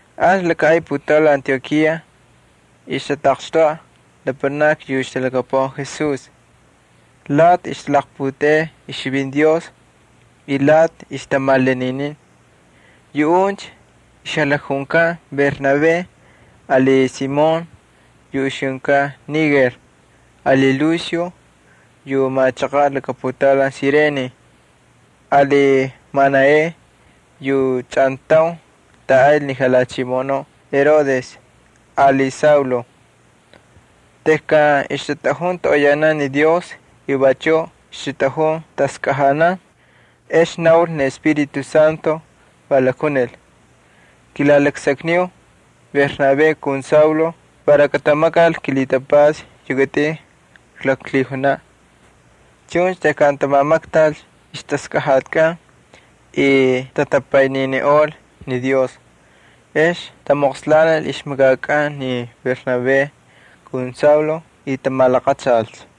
Ancha laka ay putaulan Antiokía ixtataqxtoꞌa lapanakni yu ixtalhakapuꞌan Jesús, lati ixtalaqputeꞌey ixchivinti Dios y lati ixtamalaninin. Yuꞌuncha ixlakjunkan Bernabé, ali Simón yu ixjunkan Niger, ali Lucio yu machaqaꞌ laka putaulan Cirene, ali Manaén yu chꞌantaun tꞌaꞌaynl ni jalhachimoꞌonuꞌ Herodes, ali Saulo. Tejkan ixtatꞌajun toꞌoyanan ni Dios y vachuꞌ ixtatꞌajun taskꞌajanan ex naul ni Espíritu Santo, va lakjunil: —Kilalaksakniu Bernabé kun Saulo para katamakal kilhitapatsa yu kitꞌin kaklaklhijunaꞌ. Chuncha tejkan tamamaktal ixtaskꞌajatikꞌan y tatapayniniꞌol ni Dios ex tamoqslanil ixmakakꞌan ni Bernabé ali Saulo y tamalaqachalcha.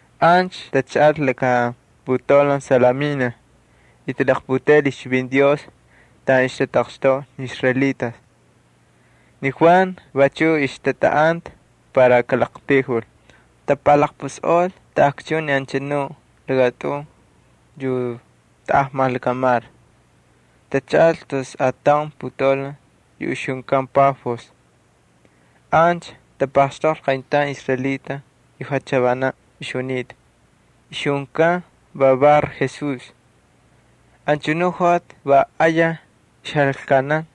Ancha tachaꞌal laka putaulan Salamina y talaqputeꞌel ixchivinti Dios taꞌan ixtatamoꞌoy ni israelitas. Ni Juan vachuꞌ ixtatꞌaꞌanta para kaꞌaqtayjul. Tapalaqpusꞌol taꞌakchun ni anchanu lakatꞌun yu taꞌajmal lakamar, tachaꞌal tus ataun putaulan yu ixjunkan Pafos. Ancha tapaxtoqlhi qayntaun israelita yu jachavanaꞌ ixjunita, ixjunkan va Bar-Jesús. Anchanu joꞌati va ayaj ixjalaklkanan,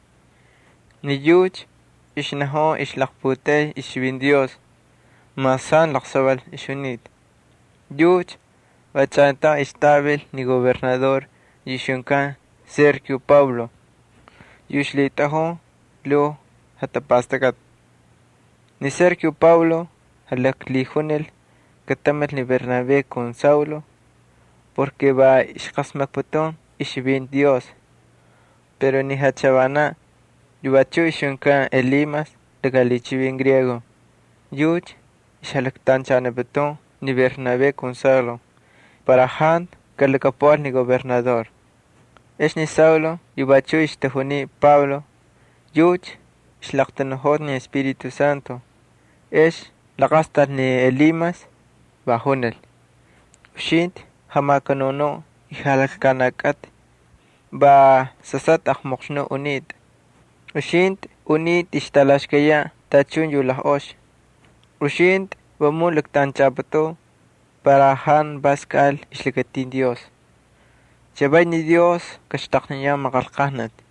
ni yucha ixnajun ixlaqputeꞌey ixchivinti Dios mas jantu laqsaval ixjunita. Yucha va chꞌantaun ixtꞌavil ni gobernador yu ixjunkan Sergio Paulo, yu ixlhitꞌajun lhuu jatapastakꞌati. Ni Sergio Paulo jalaklhijunil katamil ni Bernabé ali Saulo, va ixqasmakputun ixchivinti Dios. Pero ni jachavanaꞌ, yu vachuꞌ ixjunkan Elimas, yucha ixjalaktanchaniputun ni Bernabé ali Saulo para jantu kalhakapuꞌal ni gobernador. Ex ni Saulo, yu vachuꞌ ixtajuniy Pablo, yucha ixlaqtanuꞌojota ni Espíritu Santo. Ex laqastal ni Elimas, va junil: —Uxintꞌi jamakanunuꞌ y jalaklkanaꞌ kꞌatꞌi, va sasꞌatꞌa aqmoqxnuꞌ unitꞌa, uxintꞌi unitꞌa ixtꞌalaxkayaꞌ tachun yu lajꞌox. Uxintꞌi vamun laktꞌanchꞌapꞌutꞌun para jantu vas kaꞌal ixlakatin Dios. Chavay ni Dios kaxtaqniyan maqanlqajnati.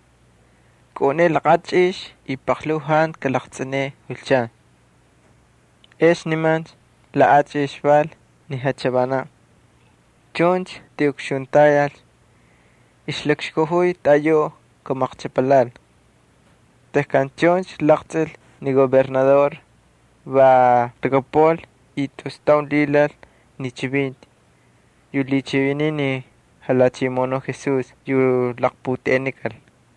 Kꞌaꞌuneꞌe laꞌachꞌix y paqlhuu jantu kalaqtsꞌineꞌe julchan. Ex nimancha laꞌachꞌix val ni jachavanaꞌ. Chuncha tiꞌukxuntayalcha, ixlakxkajuy taꞌayuꞌ kamaqchꞌapalhaꞌal. Tejkan chuncha laqtsꞌil ni gobernador va lhakapuꞌal y tus taun lhilal ni chivinti yu lhichiviniy ni Jalhachimoꞌonuꞌ Jesús yu laqputeꞌenikal.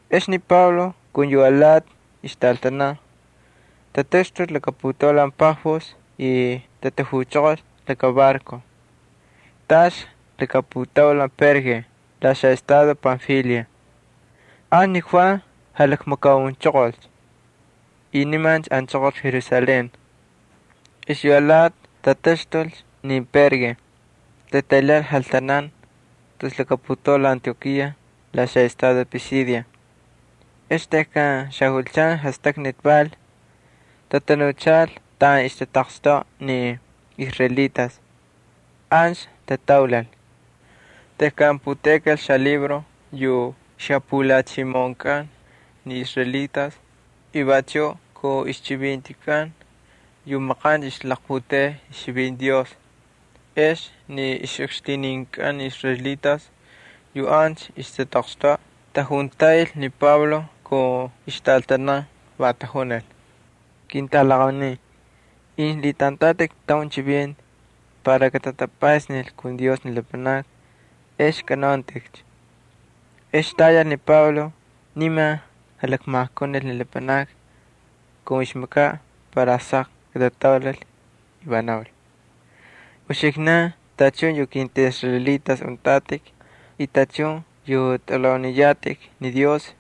Ex ni Pablo ali yu alati ixtꞌaltanan tataxtulcha laka putaulan Pafos y tatajuchoqolcha laka barco. Taꞌalcha laka putaulan Perge la xaꞌestado Panfilia. Ancha ni Juan jalakmakaunchoqolcha y nimancha anchoqol Jerusalén. Y yu alati tataxtulcha ni Perge, tataylhaꞌal jaltanan tus laka putaulan Antiokía la xaꞌestado Pisidia. Ex tejkan xajulchan jastaknati val, tatanuchal taꞌan ixtatamoꞌoy ni israelitas, ancha tataulal. Tejkan puteꞌekal xalibro yu ixjapulhichimoꞌonkꞌan ni israelitas y vachuꞌ kun ixchivintikꞌan yu maqancha ixtalaqputeꞌey ixchivinti Dios, ex ni ixꞌukxtininkꞌan ni israelitas yu ancha ixtataqxtoꞌa va tajuntaꞌil ni Pablo kun ixtꞌaltanan. Va tajunil: —Ketꞌalaqaunin, incha lhitꞌantꞌatꞌik taun chivinti para katatapꞌaysnil kun Dios ni lapanakni ex kanauntꞌikcha. Ex tayal ni Pablo, niman jalakmajkunil ni lapanakni kun ixmakaꞌ para saq katataulal, y va naul: —Uxiknan tachun yu kintꞌaꞌisraelitas untꞌatꞌik y tachun yu tꞌalhauniyatꞌik ni Dios,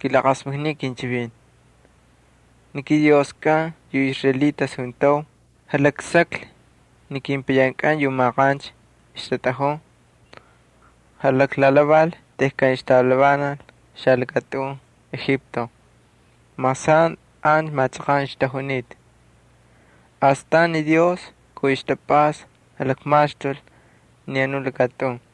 kilaqasmakniu kinchivinti. Ni kiDioskꞌan yu israelitas juntau jalaksaklhi ni kepayankꞌan yu maqancha ixtatꞌajun. Jalaklalhaval tejkan ixtavilanal xalakatꞌun Egipto mas jantu an machaqan ixtajunita. Astan ni Dios kun ixtapꞌasta jalakmaxtul ni anu lakatꞌun.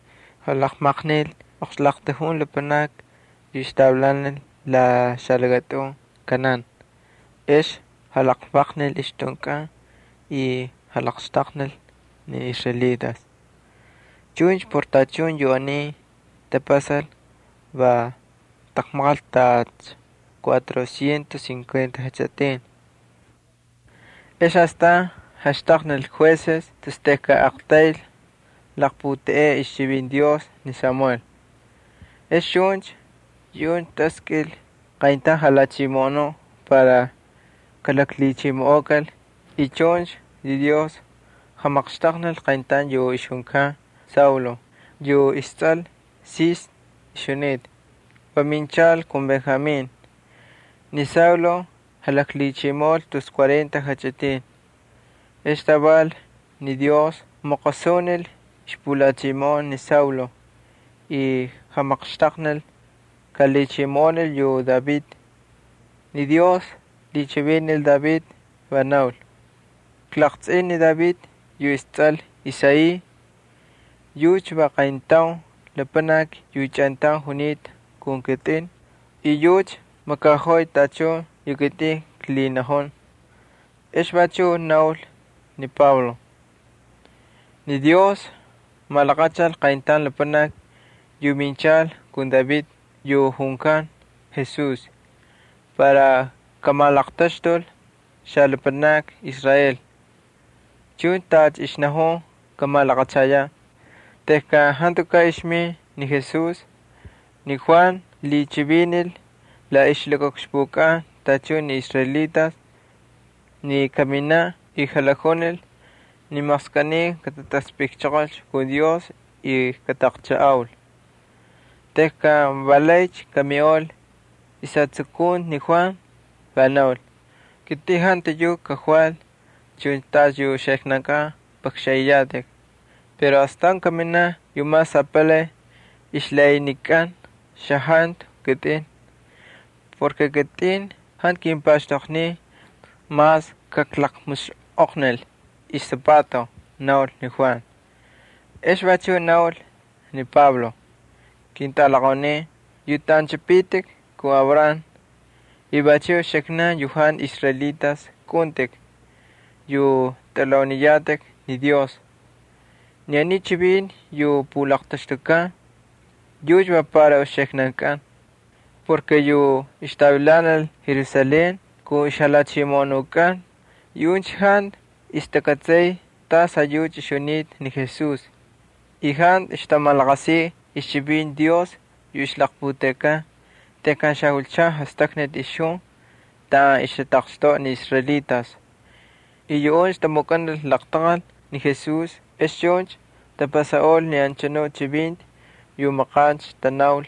Jalaqmaqnil oqxlaqtujun lapanakni yu ixtavilanal la xalakatꞌun Canaán ex jalaqlvaqnil ixtꞌunkꞌan y jalaqxtaqnil ni israelitas. Chuncha por tachun yu aniy tapasal va taqmaqal tacha cuatro cientos cincuenta jachꞌitin. Ex astan jaxtaqnikal jueces tus tejkan aqtayl laqputeꞌey ixchivinti Dios ni Samuel. Ex chuncha yuꞌuncha taskꞌil qayntaun jalhachimoꞌonuꞌ para kalaklhichimoꞌokal y chuncha yu Dios jamaqxtaqnil qayntaun yu ixjunkan Saulo, yu istsꞌal Sis ixjunita, va minchal kun Benjamín. Ni Saulo jalaklhichimoꞌol tus cuarenta jachꞌitin. Ex taval ni Dios maqosunil ixpulhachimoꞌon ni Saulo, va jamaqxtaqnil kalhichimoꞌonul yu David. Ni Dios lhichivinil David, va naul: “Klaqtsꞌin ni David yu istsꞌal Isaí. Yucha va qayntaun lapanaki yu chꞌantaun junita kun kitꞌin y yucha makaꞌojoy tachun yu kitꞌin klhinajun.” Ex vachuꞌ naul ni Pablo: —Ni Dios malaqachal qayntaun lapanaki yu minchal kun David yu junkan Jesús para kamalaqtaxtul xalapanakni Israel, chuncha tacha ixnajunta kamalaqachayaꞌ. Tejkan jantukaꞌ ixmin ni Jesús ni Juan lhichivinil la ixlakaꞌukxpukꞌan tachun ni israelitas ni kaminaꞌ y jalakjunil ni maqskꞌiniy katamapaxal ixjatapastakꞌatkꞌan y kataꞌaqchajꞌaul. Tejkan va laycha kamiꞌol ixjatsukunti ni Juan, va naul: “Kitꞌin jantu yuꞌ kakval chuncha tacha yu uxiknankꞌan pꞌakxanꞌiyatꞌik, pero astan kaminaꞌ yu mas apalay ay xajantu kitꞌin. Ni kitꞌin jantu kimpaxtoqniy mas kaklaqmusxꞌoqnil isapato,” naul ni Juan. Ex vachuꞌ naul ni Pablo: —Ketꞌalaqaunin yu tꞌanchꞌipitikcha kun Abraham y vachuꞌ uxiknankꞌan yu jantu israelitas kꞌaꞌuntꞌik yu tꞌalhauniyatꞌik ni Dios, ni aniy chivinti yu pulaqtaxtukan yucha va para uxiknankꞌan. Yu ixtavilanal Jerusalén kun ixjalhachimoꞌonunkꞌan, yuꞌuncha jantu ixtakꞌatsay tasꞌayucha ixjunita ni Jesús y jantu ixtamalaqasiy ixchivinti Dios yu ixlaqputeꞌekan xajulchan jastaknati taꞌan ixtatamoꞌoy ni israelitas. Yuꞌuncha tamukꞌanil laqtaqal ni Jesús ex chuncha tapasaꞌol ni anchanu chivinti yu maqancha tanaul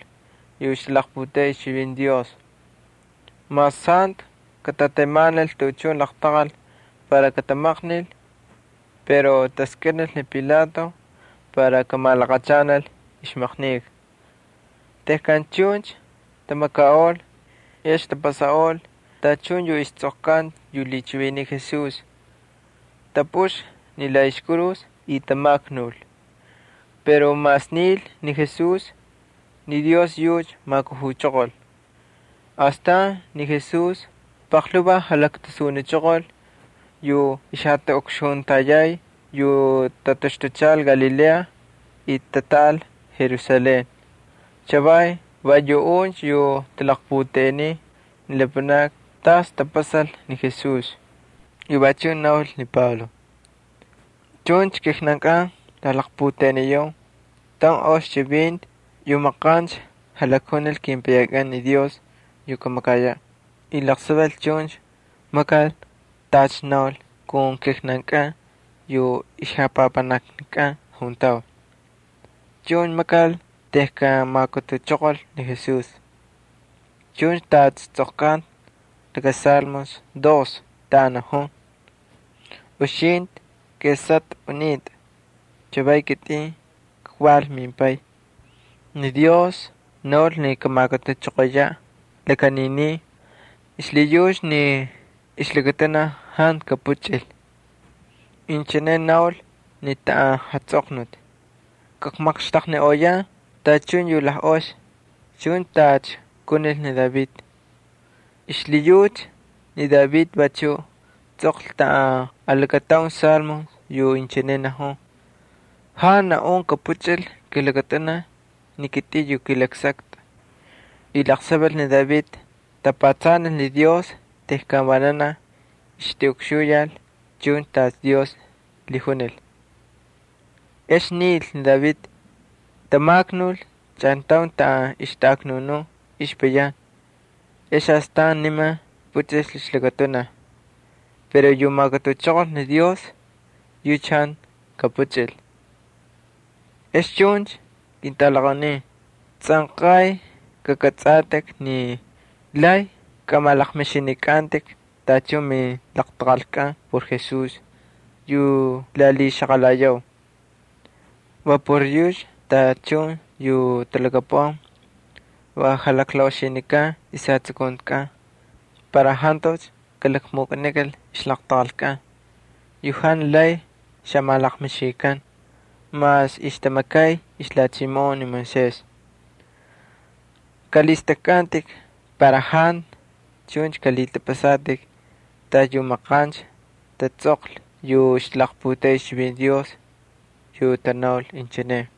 yu ixtalaqputeꞌey ixchivinti Dios. Mas jantu katatemanil tuꞌuchun laqtaqal para katamaqnil, pero taskꞌinil ni Pilato para kamalaqachanal ixmaqnika. Tejkan chuncha tamakaꞌol, ex tapasaꞌol tachun yu istsꞌoqkanta yu lhichiviniy Jesús, tapꞌuxlhi ni la ixkurus y tamaknul. Pero mas nil ni Jesús, ni Dios yucha majkujuchoqol. Astan ni Jesús paqlhuvaj jalaktasunichoqol yu ixjatꞌaꞌukxuntayay yu tataxtuchal Galilea y tatꞌaꞌal Jerusalén. Chavay va yuꞌuncha yu talaqputeꞌeniy ni lapanakni tacha tapasal ni Jesús. Y vachuꞌ naul ni Pablo: —Chuncha kijnankꞌan klalaqputeꞌeniyau taun ox chivinti yu maqancha jalakjunil kepayankꞌan ni Dios yu kamakayaꞌ. Laqsaval chuncha makal tacha naul kun kijnankꞌan yu ixjapapanaknakꞌan juntau. Chuncha makal tejkan majkujuchoqol ni Jesús. Chuncha tacha tsꞌoqkanta laka Salmo dos taꞌan najun: “Uxintꞌi kesꞌatꞌa unitꞌa, chavay kitꞌin kval mimPay.” Ni Dios naul ni kamajkujuchoqoyaꞌ laka janinin xlhiyucha ni ixlakatunaj jantu kapuchꞌil. Inchine naul ni taꞌan tsꞌoqkanta: “Kakmaqxtaqniꞌoyan tachun yu lajꞌox chuncha tacha kunil ni David.” Xlhiyucha ni David vachuꞌ tsꞌoqlhi taꞌan alakataun Salmo yu inchine najun: “Jantu naꞌun kapuchꞌil kilakatunaj ni kitꞌin yu kꞌilaksaktꞌa.” Laqsaval ni David tapatsanil ni Dios tejkan vananaj ixtiꞌukxuyal chuncha tacha Dios lhijunil. Ex nil ni David, tamaknul chꞌantaun taꞌan ixtaꞌaknunun ixjapayan, ex astan niman puchꞌil ixlakatunaj. Pero yu majkujuchoqol ni Dios yucha jantu kapuchꞌil. Ex chuncha, ketꞌalaqaunin, tsꞌanqay kakꞌatsꞌatꞌik ni lay kamalaqmixinikꞌantꞌik tachun milaqtaqalkꞌan por Jesús yu klalhixaqalayau. Va por yucha tachun yu talhakapuꞌan va jalaqlaꞌoxinikan ixjatsukuntikꞌan para jantucha kalakmukꞌanikal ixlaqtaqalkꞌan yu jantu lay xamalaqmixinikan mas ixtamakay ixlhachimoꞌon ni Moisés. Kꞌalhistꞌakkꞌantꞌik para jantu chun kalhitꞌapꞌasatꞌik tacha yu maqancha tatsꞌoqlhi yu ixtalaqputeꞌey ixchivinti Dios yu tanaul inchine: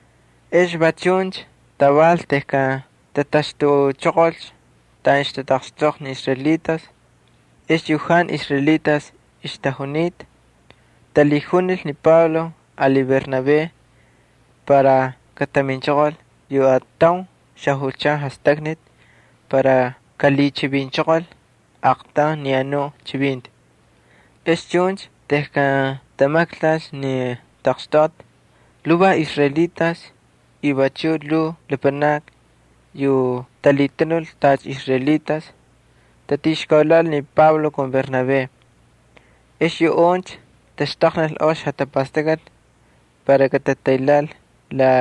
Ex va chuncha taval tejkan tataxtuchoqolcha taꞌan ixtatamoꞌoy ni israelitas, ex yu jantu israelitas ixtajunita talhijunil ni Pablo ali Bernabé para kataminchoqol yu ataun xajulchan jastaknati para kalhichivinchoqol aaqtaun ni anu chivinti. Ex chuncha tejkan tamaktalcha ni taqxtoꞌati lhuvaj israelitas y vachuꞌ lhuu lapanakni yu talhitanul tacha israelitas tatixkaulhaꞌal ni Pablo ali Bernabé. Ex yuꞌuncha taxtaqnil ox jatapastakꞌati para katataylhaꞌal la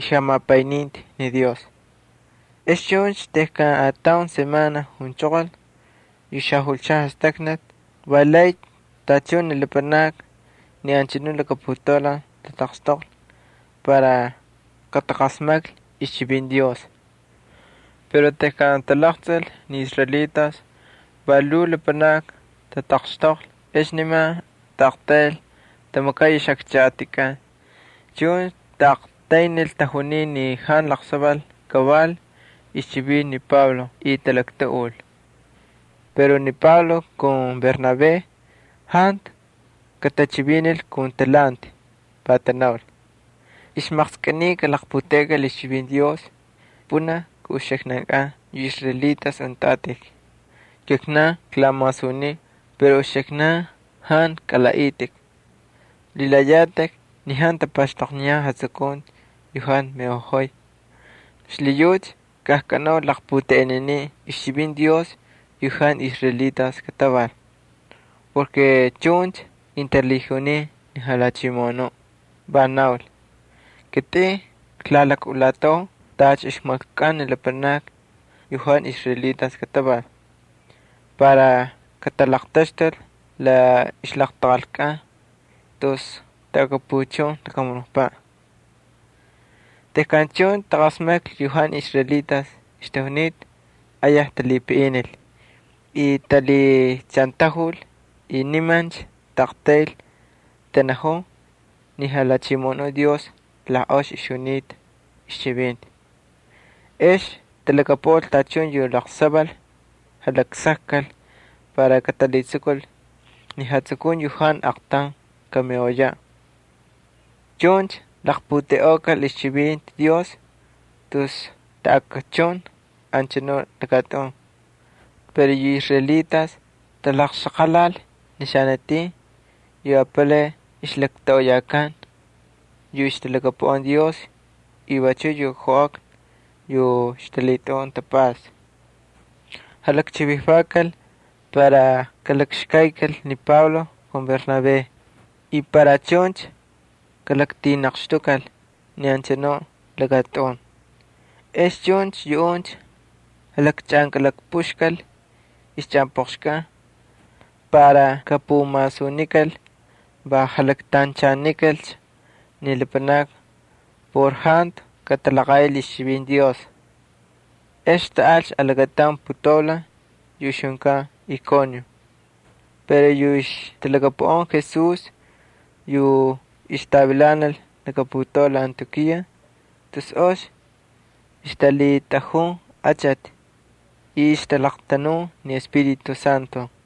ixjamapayninti ni Dios. Ex chuncha tejkan ataun semana junchoqol yu xajulchan jastaknati, va tataqxtoqlhi valaycha tachun ni lapanakni ni anchanu laka putaulan para kataqasmaklhi ixchivinti Dios. Pero tejkan talaqtsꞌil ni israelitas va lhuu lapanakni tataqxtoqlhi ex nimancha taꞌaqtayl tamakay ixꞌakchaꞌatikꞌan. Chuncha taꞌaqtaynil talhichiviniy ni Pablo yu jantu laqsaval kaval y talaktuꞌul. Pero ni Pablo ali Bernabé jantu katachivinil kun talhanti, va tanaul: —Ixmaqskꞌiniy kalaqputeꞌekal ixchivinti Dios pꞌunaj kun uxiknankꞌan yu israelitas untꞌatꞌik. Kijnan klamasuniu pero uxiknankꞌan jantu kalaꞌaꞌitꞌik, lhilayatꞌik ni jantu tapaxtoqniyan jatsukunti yu jantu miꞌojoy. Xlhiyucha kajkꞌanaucha jalaqputeꞌeninin ixchivinti Dios yu jantu israelitas kataval. Va chuncha kintalhijunin ni Jalhachimoꞌonuꞌ, va naul: Kitꞌin klalakꞌulatau tacha ixmaklkukꞌan ni lapanakni yu jantu israelitas kataval, para katalaqtaxtul lapanakni tus taꞌakapuchun lakamunukpaꞌ. Tejkan chuncha taqasmaklhi yu jantu israelitas ixtajunita, ayaj talhipaꞌinil y talhiꞌachantajul y nimancha aqtayl tanajun ni Jalhachimoꞌonuꞌ Dios la ox ixjunita ixchivinti. Ex talhakapuꞌal tachun yu laqsaval jalaksakkal para katalhitsukul ni jatsukunti yu jantu aqtaun kamiꞌoyaꞌ. Chuncha laqputeꞌeꞌokal ixchivinti Dios tus taꞌakchun anchanu lakatꞌun. Pero yu israelitas taxaqalal ni xanatin yu apalay ixlaktoꞌoyakan yu ixtalhakapuꞌan Dios y vachuꞌ yu joꞌakna yu ixtalhitꞌajun tapꞌasta. Jalakchivijvakal para kalakxkaykal ni Pablo ali Bernabé y para chuncha kalaqtinaqxtukal ni anchanu lakatꞌun. Ex chuncha yuꞌuncha jalakchꞌankꞌalapꞌuxkal ixchꞌanpꞌoqxkꞌan para kapumasunikal va jalaktanchanikalcha ni lapanakni por jantu katalaqaꞌil ixchivinti Dios. Ex taꞌalcha alakataun putaulan yu ixjunkan Iconio. Pero yu ixtalhakapuꞌan Jesús yu ixtavilanal laka putaulan Antiokía tus ox ixtalhitꞌajun achati y ixtalaqtanun ni Espíritu Santo.